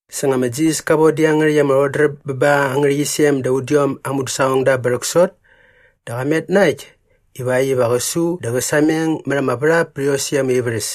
Sa nga ma Jisas ka von dä iangärhäkt ama rhodräp bä ba aa ngärhäqyisem da udiom aa mudäsaqongda bä rhäksot dä qa met na äkt ivakt iva qä su dä qä sameng mät ama värhap pät iosäkt ama ivärhäs.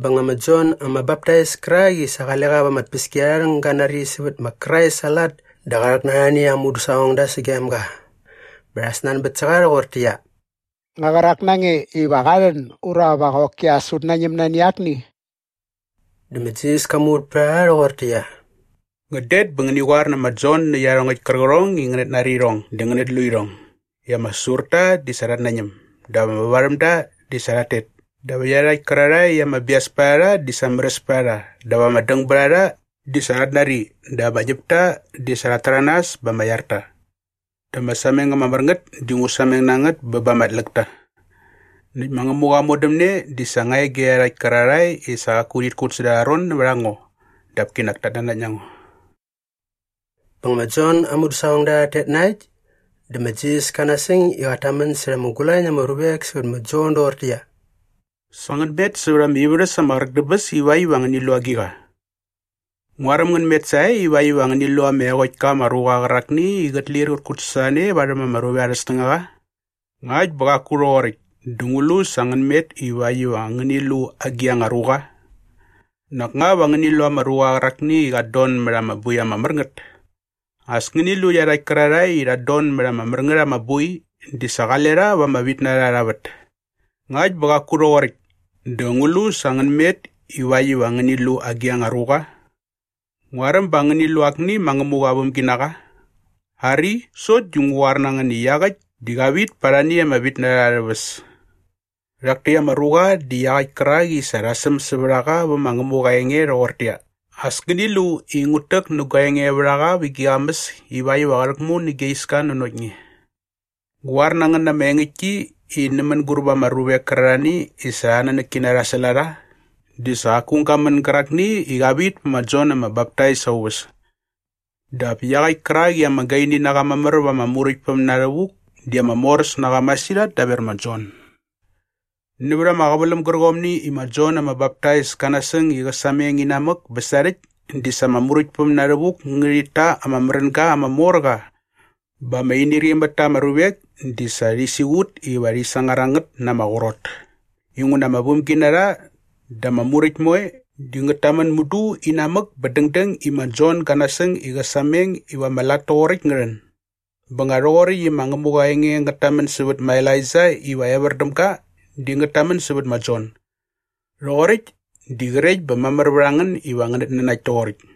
Bä nga ma Jon ama Baptais kärak i sa qale qa va ama tpäskiarharhäng ga nari sävät ma Krais aa lat dä qa rhäk na arhani aa mudäsaqongda sagem ga bä rha snanbät sä qa rhoqortäqyia, “Nga qärak na nge iva qa rhän ura va qoki as ut nañäm nani akni?” Dä ma Jisas ka muvät pät a rha rhoqortäqyia, “Ngän det bä ngäni qoar nä ma Jon nä iarhongäkt kärqärhong i ngänät nari irhong dä ngänät lu irhong i ama säsurta di sa rhat nañäm dap ama vävarhämda di sa rhat tet dap iarhakt kärarhae i ama bias pät a rha di sa märäs pät a rha dap ama dängbärharha di sa rhat nari dap ama ñäpta di sa rhat täranas bä ama iar ta. Dä ama sameng ama mär ngät di ngu sameng na ngät bä ba ama tläkta. Näkt ma Ngämuqa aa modämne di sa nga e ge iarhakt kärarhae i sa qaku rhit kut säda arha ron nävät a ngo dap kinak tat nanakt na ngo.” Bä nga ma Jon aa mudäsaqongda rhat tet na äkt dä ma Jisas ka nasäng i qat tamän särha ama gulañ na ama ruvek sävät ma Jon doqortäqyia, “Sa ngän met sävät ama ivärhäs ama qräk dä bäs ivakt iva ngäni lu agiqa? Nguaräm ngän met sae ivakt iva ngäni lu ama eqokt ka ama ruqa qärakni i qät lir qät kutsasorhane varhäm ama ruvek arhä snängaqa? Ngakt bä qaku rhoqoräkt dä ngu lu sa ngän met ivakt iva ngäni lu agi anga ruqa? Nak nga va ngäni lu ama ruqa qärakni i qat don mät ama boi ama mär ngät? As ngäni lu i iarhakt kärarhae i rhat don mät ama mär ngät ama boi di sa qale rha va ama vitnarha arha vät. Ngakt bä qaku rhoqoräkt dä ngu lu sa ngän met ivakt iva ngäni lu agi anga ruqa? Nguaräm ba ngäni lu akni ma Ngämuqa aa vämginaqa? Ari, sokt di ngu qoar na ngän i iaqäkt di qa vit pät arhani ama vämginarha arhä väs. Rhak täkt ama ruqa di iaqäkt kärak i sa rha säm sävät a qa vä ma Ngämuqa aa enge rhoqortäqyia, “‘As ngäni lu i ngut täk nä gua engevärhaqa vä gi qamäs ivakt iva qä rhäkmu nä gia iska nanokt nge.’ Ngu qoar na ngän na ama engäktki i nä mänguräp ama ruvek kärarhani i sa arhä nanäkkina rha säl a rha di sa qaku aung ga män gärakni i qa vit pä ma Jon ama Baptais aa uväs. Dap iaqäkt kärak i ama gaini na qa mamär va ama Muräktpäm na rhävuk di ama moräs na qa masirhat daver ma Jon. “Nävät ama qäväläm gärqomni i ma Jon ama Baptais ka nasäng i qä sameng inamäk bä sarhäkt di sa ama Muräktpäm na rhävuk ngärhit ta ama märänga ama mor qa bä ama inirqi mät ta ama ruvek di sa rhi siqut iva rhi sangar a ngät na ama qrot inguna ama vämginarha dä ama muräkt moe di ngät tamän mudu inamäk bä dängdäng i ma Jon ga nasäng i qä sameng iva ama lat toqoräkt ngä rhän. Bä nga rhoqoräkt i ma Ngämuqa aa enge ngät tamän sävät ma Elaija iva evär däm ga di ngät tamän sävät ma Jon. Rhoqoräkt di qrekt bä mamär vät a ngän iva ngänät nanakt toqoräkt.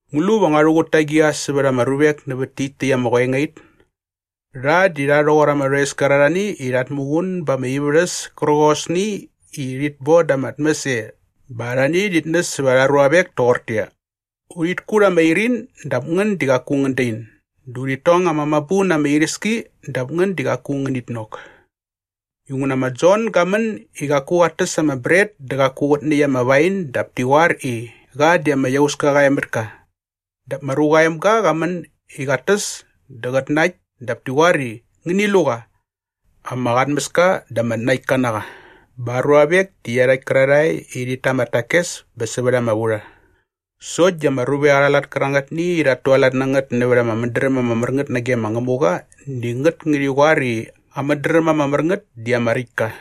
“Ngu lu va ngua rhuqut ta agiqa sävät ama ruvek nävät tit täkt ama qoengait? Rha di rha rhoqor ama rhoes kärarhani i rhat muqun ba ama ivärhäs kärqosni i rhit boda ama tmäs e bä arhani rhit näs sävät arha ruavek toqortäqyia, “‘Urhit kut ama irin dap ngän di qaku ngän dain dä urhit tong ama mabu na ama iräski dap ngän di qaku ngänit nok.’ Inguna ma Jon ga män i qaku qat täs ama bret dä qaku qät näkt ama wain dap ti qoar i, ‘Qa di ama iauska qa e mät ka.’ Dap ma Ruqa aa Emga qa män i qat täs dä qät nakt dap ti qoar i, ‘Ngäni lu qa! Ama qatmäska dä ama tnaktka na qa bä aa ruavek di iarhakt kärarhae i rhit ta ama takes bä sävät ama vurha!’ Sokt di ama ruvek arha lat kärangätni i rhat tualat na ngät nävät ama mädräm ama mär ngät nage ma Ngämuqa di ngät ngärhi qoar i aa mädräm ama mär ngät di ama räkt ka.”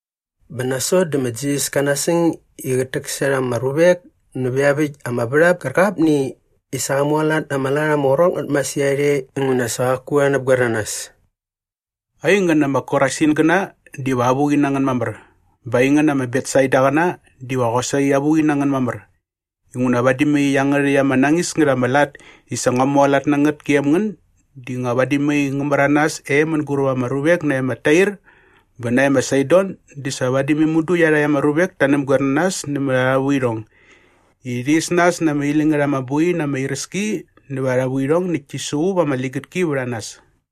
Bä nasot dä ma Jisas ka nasäng i qät täksärha ama ruvek nävä iaväkt ama värhap kärqapni i sa qa mualat na ama lat ama qrot ngät masirhat e inguna sa qaku rha näpgoer na nas. “Aingän ama Korasingäna diva avuqi na ngän mamär! Bä aingän ama Betsaidaqäna diva qosaqi avuqi na ngän mamär! Inguna vadi mai iangärhäkt ama nañis ngät ama lat i sa ngua mualat na ngät gem ngän di nga vadi mai ngä märanas e mänguräp ama ruvek nae ma Tair bä nae ma Saidon di sa vadi mudu iarhakt ama ruvek ta näpgoer na nas nämät arha vuirhong i rhi is nas na ama iläñ ngät ama boi na ama iräski nävät arha vuirhong näkt ti suqup ama ligätki vät a nas.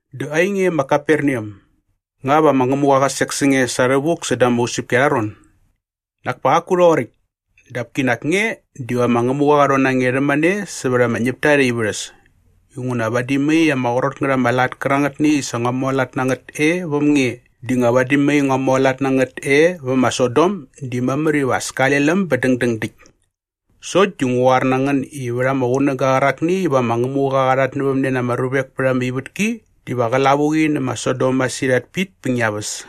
“Dä ainge ma Kaperneam, nga va ma Ngämuqa qä sek sä nge sa rhävuk säda ama usäpki arha ron? Nak pa qaku rhoqoräkt. Dap kinak nge diva ma Ngämuqa qä rhon na nge rhämane sävät ama ñäpta arhä ivärhäs. Inguna vadi mai ama qrot ngät ama lat kärangätni i sa ngua mualat na ngät e väm nge di nga vadi mai ngua mualat na ngät e väm ma Sodom di mamär iva as kale läm bä dängdäng däkt. Sokt di ngu qoar na ngän i vät ama qunäga qärakni iva ma Ngämuqa qa rhatnävämne na ama ruvek pät ama ivätki diva qä lavuqi nä ma Sodom masirhat pit pä ngia väs.”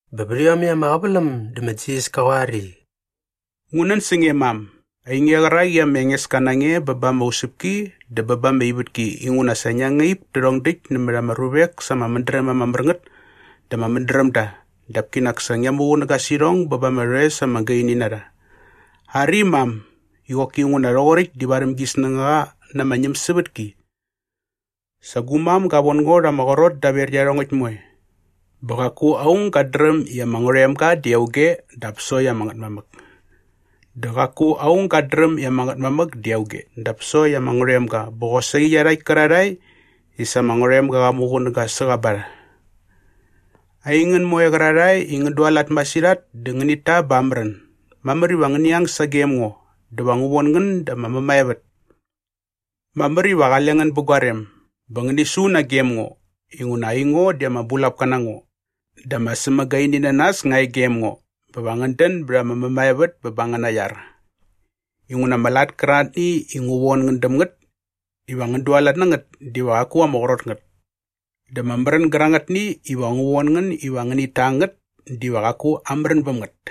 Bä vät iomäkt ama qäväläm dä ma Jisas ka qoar i, “Ngu nän sä nge mam, ainge qärak i ma Engeska na nge bä ba ama usäpki dä bä ba ama ivätki inguna sa ngia ngaip tärhong däkt nämät ama ruvek sa ama mädräm ama mär ngät dä ama mädrämda dap kinak sa ngia muqunäga sä irhong bä ba ama rhoes ama gaini na rha. Ari mam, i qoki nguna rhoqoräkt di varhäm gi snängaqa na ama ñämsävätki. “Sa gu mam ga von ngo rha ama qrot daver iarhongäkt moe. Bä qaku aung gat dräm i ama Ngärhoemga di auge dap sokt ama Ngätmamäk. Dä qaku aung gat dräm i ama Ngätmamäk di auge dap sokt ama Ngärhoemga bä qosaqi iarhakt kärarhae i sa ama Ngärhoemga qa muqunäga sä qa ba rha. “Aingän moe qärarhae i ngän dualat masirhat dä ngänit ta bä amärän, mamär iva ngäni ang sagem ngo dä va ngu von ngän da ama mämaevät. Mamär iva qale ngän bä gua rem bä ngäni su nagem ngo inguna aingo di ama bulapka na ngo dä ama sämagaininanas nga e gem ngo bä va ngän dän bät ama mämaevät bä ba angäna iar. Inguna ama lat kärangätni iva ngu von ngän däm ngät iva ngän dualat na ngät diva qaku ama qrot ngät. Dä ama märän gärangätni iva ngu von ngän iva ngänit ta ngät diva qaku amärän bäm ngät.”